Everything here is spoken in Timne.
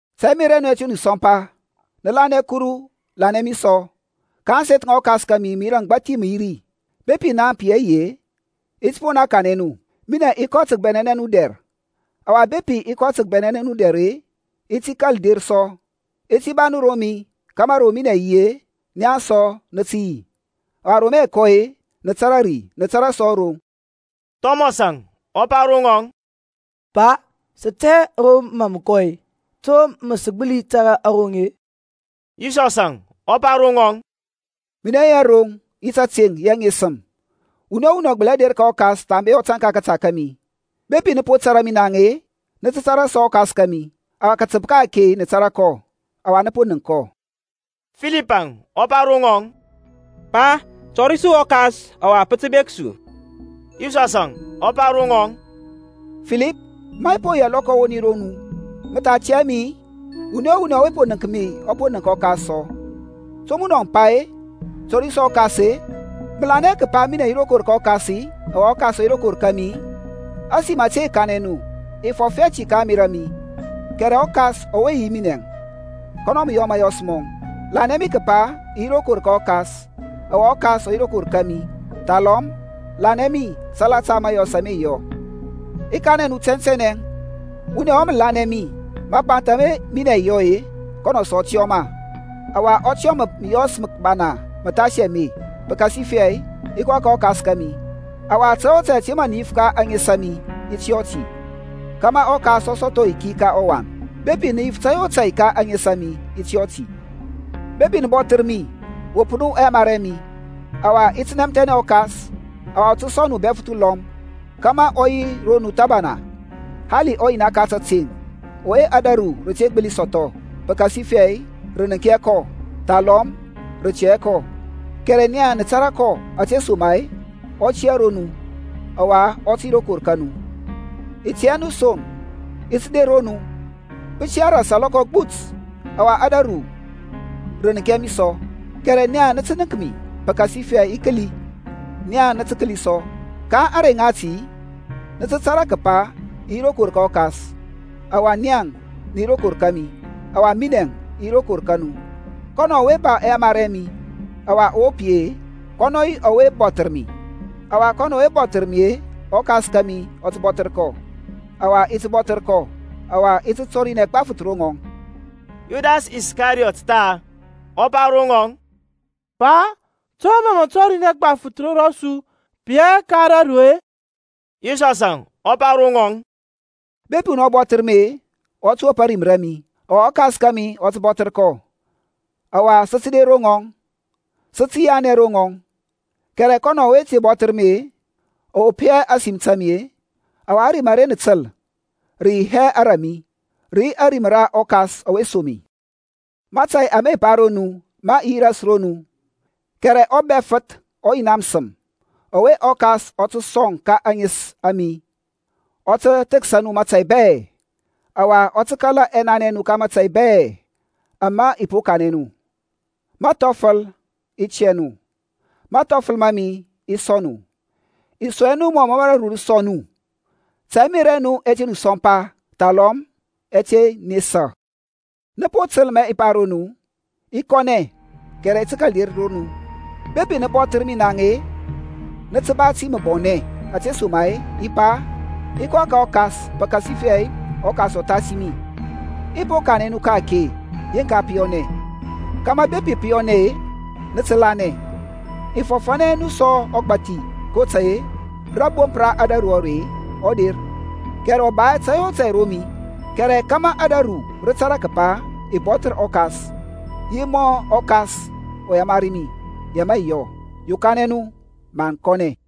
Ta ɛmerȧ ɛ nu ɛ te nu sɔmpa: nə lanɛ Kuru, lanɛ mi sɔ. Ka ȧŋseth ŋa ɔKas kȧmi məyira məgbathi me yi ri; bepi naŋ pə yi hɛ yi-e, i ti poŋ naŋ kanɛ nu. Minɛŋ i kɔ tə kəbɛnɛnɛ nu dɛr. Ɔwa bepi i kɔ tə kəbɛnɛnɛ nu dɛr-e, i ti kȧl der sɔ, i ti ba nu ro mi: kȧmȧ ro minɛŋ i yi, nia sɔ nə tə yi. Ɔwa ro mə i kɔ-e nə tȧrȧ ri, nə tȧrȧ sɔ aroŋ. Thɔmɔsȧŋ ɔ pa ro ŋɔŋ, Pa, sə tɛ hɛ ro mȧ mə kɔ-e; to mə sə gbəli tȧrȧ aroŋ-e? Yisɔsȧŋ ɔ pa ro ŋɔŋ, Minɛŋ yi aroŋ, yi tȧteŋ, yi aŋesəm: wuni o wuni ɔ gbəli hɛ der ka ɔKas thambe ɔ tȧŋ ka kȧta kȧmi. Bepi nə po tȧrȧ mi naŋ-e, nə tə tȧrȧ sɔ ɔKas kȧmi: ɔwa kətəp ka-ake nə tȧrȧ kɔ, ɔwa nə po nənk kɔ. Filipȧŋ ɔ pa ro ŋɔŋ, Pa, tɔri su ɔKas, ɔwa pə tə bek su. Yisɔsȧŋ ɔ pa ro ŋɔŋ, Filip, ma i po yi alɔkɔ awoni ro nu, mə tha tɛ hɛ mi-i? Wuni o wuni ɔwe po nənk mi ɔ po nənk ɔKas sɔ: to munɔ mə pa-e, Tɔri su ɔKas-e? Mə lanɛ hɛ kəpa minɛ yi rokor ka ɔKas-i, ɔwa ɔKas ɔ yi rokor ka mi-i? Ȧsim ȧte i kanɛ nu, i fɔf hɛ ti ka ȧŋmerȧ a mi, kɛrɛ ɔKas ɔwe yi yi minɛŋ, kɔnɔ mə yɔ mȧyɔs mɔŋ. Lanɛ mi kəpa i yi rokor ka ɔKas, ɔwa ɔKas ɔ yi rokor kȧmi, thalɔm lanɛ mi salata mȧyɔs ama i yɔ. I kanɛ nu tɛntɛnɛ, Wuni ɔwe mə lanɛ mi, mapanth ama minɛ i yɔ-e, kɔnɔ sɔ ɔ tə yɔ ma; ɔwa ɔ tə yɔ məyɔs məbana məthasi ame, pəkasifɛ i kɔ ka ɔKas kȧmi. Ɔwa tȧy o tȧy ȧte mə nə yif ka ȧŋes a mi, i ti yɔ ti, kȧmȧ ɔKas ɔ sɔthɔ ayiki ka ɔWan. Bepi nə yif tȧy o tȧy ka ȧŋes a mi, i ti yɔ ti. Bepi nə bɔthər mi, wop nu ɛyamari ɛ mi. Ɔwa i ti nɛmthɛnɛ ɔKas, ɔwa ɔ tə sɔŋ nu uBɛfəth ulɔm, kȧmȧ ɔ yi ro nu thəbana. Hali ɔYina ka tȧteŋ; ɔwe ȧdȧru rə te gbəli sɔthɔ, pəkasifɛ rə nənk hɛ kɔ, thalɔm rə tɛ hɛ kɔ; kɛrɛ nia nə tȧrȧ kɔ, ȧtesoma-e ɔ tiyȧ ro nu, ɔwa ɔ tə yi rokor ka nu. I tey hɛ nu son, i ti der ro nu. Pə tiyȧ ras alɔkɔ agbut, ɔwa ȧdȧru rə nənk hɛ mi sɔ: kɛrɛ nia nə tə nənk mi: pəkasifɛ i kəli, nia nə tə kəli sɔ. Ka ȧŋrey ŋati nə tə tȧrȧ kəpa i yi rokor ka ɔKas, ɔwa nia nə yi rokor kȧmi, ɔwa minɛŋ i yi rokor ka nu. Kɔnɔ ɔwe ba ɛyamari ɛ mi, ɔwa ɔ wop yi-e, kɔnɔ yi ɔwe mə bɔthər mi: ɔwa kɔnɔ ɔwe mə bɔthər mi ɔKas kȧmi ɔ tə bɔthər kɔ, ɔwa i ti bɔthər kɔ, ɔwa i ti tɔrinɛ gbafəth ro ŋɔŋ. Yudasȧŋ, Iskariyɔt tha, ɔ pa ro ŋɔŋ, Pa, to mȧ mə tɔrinɛ gbafəth ro su, pə yi hɛ ka raru-e? Yisɔsȧŋ ɔ pa ro ŋɔŋ, Bepi wuni ɔ bɔthər mi-e, ɔ tə wop ȧrim ra mi: ɔwa ɔKas kȧmi ɔ tə bɔthər kɔ, ɔwa sə tə der ro ŋɔŋ, sə tə yianɛ ro ŋɔŋ. Kɛrɛ kɔnɔ ɔwe te bɔthər mi-e, ɔ wop hɛ ȧsim ta mi-e: ɔwa ȧrim ara nə təl, rə yi hɛ ara mi, rə yi ȧrim ra ɔKas ɔwe som mi. Mȧtȧy ame i pa ro nu, ma i yi ras ro nu. Kɛrɛ ɔBɛfəth, ɔYina məsəm, ɔwe ɔKas ɔ tə som ka ȧŋes a mi, ɔ tə thəksa nu mȧtȧy bɛ, ɔwa ɔ tə kala ɛnanɛ ɛ nu ka mȧtȧy bɛ ama i po kanɛ nu. Məthɔfəl i tiyȧ nu, mathɔfəl ma mi i sɔŋ nu: i sɔŋ hɛ nu mɔ mə ȧdȧru rə sɔŋ nu. Ta ɛmerȧ ɛ nu ɛ te nu sɔmpa, thalɔm ɛ te nesa. Nə po təl ma i pa ro nu, I kɔnɛ, kɛrɛ i ti kȧl der ro nu. Bepi nə bɔthər mi naŋ-e, nə tə ba ti məbɔnɛ, ȧtesoma-e i pa, i kɔ ka ɔKas; pəkasifɛ ɔKas ɔ thasi mi. I po kanɛ nu ka-ake yeŋka pə yɔnɛ, kȧmȧ bepi pə po yɔnɛ-e, nə tə lanɛ. I fɔfȧnɛ hɛ nu sɔ ɔgbȧthi: kotȧy-e rȧbomp ra ȧdȧru are ɔ der, kɛrɛ ɔ ba hɛ tȧy o tȧy ro mi. Kɛrɛ kȧmȧ ȧdȧru rə tȧrȧ kəpa i bɔthər ɔKas, yi mɔ mə ɔKas ɔ yamari mi, ya mə i yɔ. Yokanɛ nu maŋ kɔnɛ.